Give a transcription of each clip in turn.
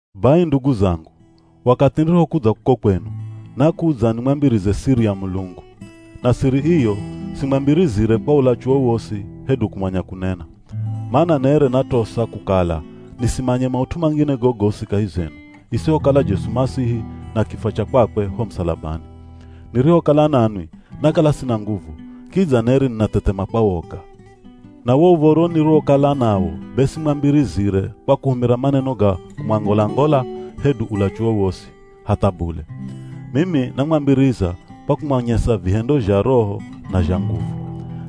Bai ndugu zangu, wakathi nirihokudza kuko kwenu, nakudza nimwambirize siri ya Mulungu. Na siri iyo simwambirizire kwa ulachu wowosi hedu kumanya kunena. Mana nere natosa kukala nisimanye maut'u mangine gogosi kahi zenu, isihokala Jesu Masihi na kifwa cha kwakwe ho musalabani. Nirihokala nanwi, nakala sina nguvu, kidza nere ninathethema kwa woga. Na wo uv̱oro niriwokala nawo be simwambirizire kwa kuhumira maneno ga kumwangola-ngola hedu ulachu wowosi, hatha bule. Mimi namwambiriza kwa kumwanyesa vihendo zha Roho na zha nguvu.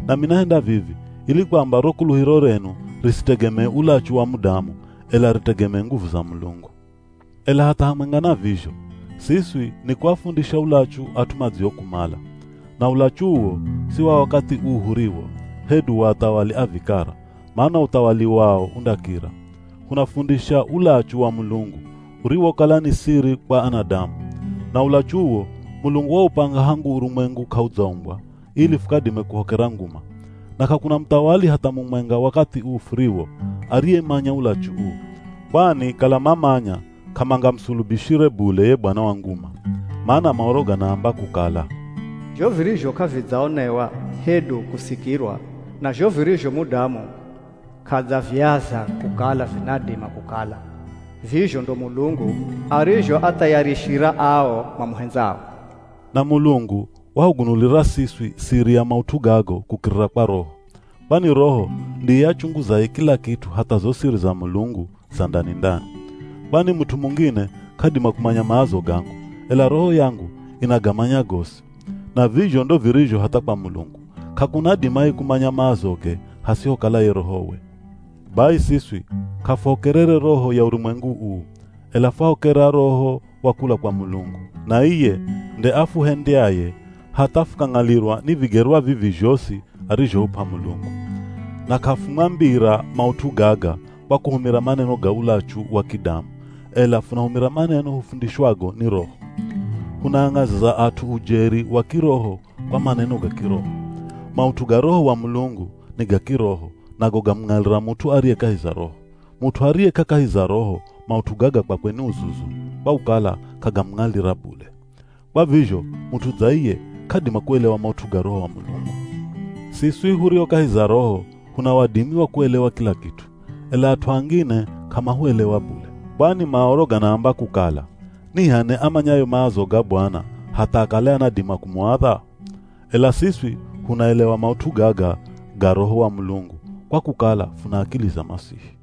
Nami nahenda vivi ili kwamba ro kuluhiro renu risitegemee ulachu wa mudamu, ela ritegemee nguvu za Mulungu. Ela hatha hamwenga na vizho, siswi nikuafundisha ulachu at'u madziokumala. Na ulachu uwo si wa wakathi uu huriwo, hedu wa athawali a vikara, mana uthawali wao undakira. Hunafundisha ulachu wa Mulungu, uriwokala ni siri kwa anadamu. Na ulachu uwo, Mulungu waupanga hangu urumwengu k'audzaumbwa ili fukadime kuhokera nguma. Na k'akuna muthawali hatha mumwenga wakathi uu furiwo ariyemanya ulachu uu. Kwani kala mamanya k'amangamusulubishire bule ye Bwana wa nguma. Mana Maoro ganaamba kukala, “Zho virizho k'avidzaonewa hedu kusikirwa, na zho virizho mudamu k'adzaviaza kukala vinadima kukala, vizho ndo Mulungu arizhoathayarishira ao mamuhendzao.” Na Mulungu wahugunulira siswi siri ya maut'u gago kukirira kwa Roho. Kwani Roho ndiye achunguzaye kila kit'u hatha zo siri za Mulungu za ndani-ndani. Kwani mut'u mungine k'adima kumanya maazo gangu, ela roho yangu inagamanya gosi. Na vizho ndo virizho hatha kwa Mulungu, k'akuna adimaye kumanya maazoge hasihokala ye Rohowe. Bai siswi k'afuhokerere roho ya urumwengu uu, ela fwahokera Roho wa kula kwa Mulungu. Na iye nde afuhendyaye hatha fukang'alirwa ni vigerwa vivi zhosi arizhohup'a Mulungu. Na k'afumwambira maut'u gaga kwa kuhumira maneno ga ulachu wa kidamu, ela funahumira maneno hufundishwago ni Roho. Hunaang'aziza at'u ujeri wa kiroho kwa maneno ga kiroho. Maut'u ga Roho wa Mulungu, ni ga kiroho nago gamung'alira mut'u ariye kahi za Roho. Mut'u ariye k'akahi za Roho maut'u gaga kwakwe ni uzuzu kwa kukala k'agamung'alira bule. Kwa vizho mut'u dza iye, k'adima kuelewa maut'u ga Roho wa Mulungu. Siswi hurio kahi za Roho huna wadimi wa kuelewa kila kit'u, ela at'u angine k'amahuelewa bule. Kwani Maoro ganaamba kukala, “Ni h'ani amanyaye maazo ga Bwana, hatha akale anadima kumuadha?” Ela siswi hunaelewa maut'u gaga ga Roho wa Mulungu kwa kukala funa akili za Masihi.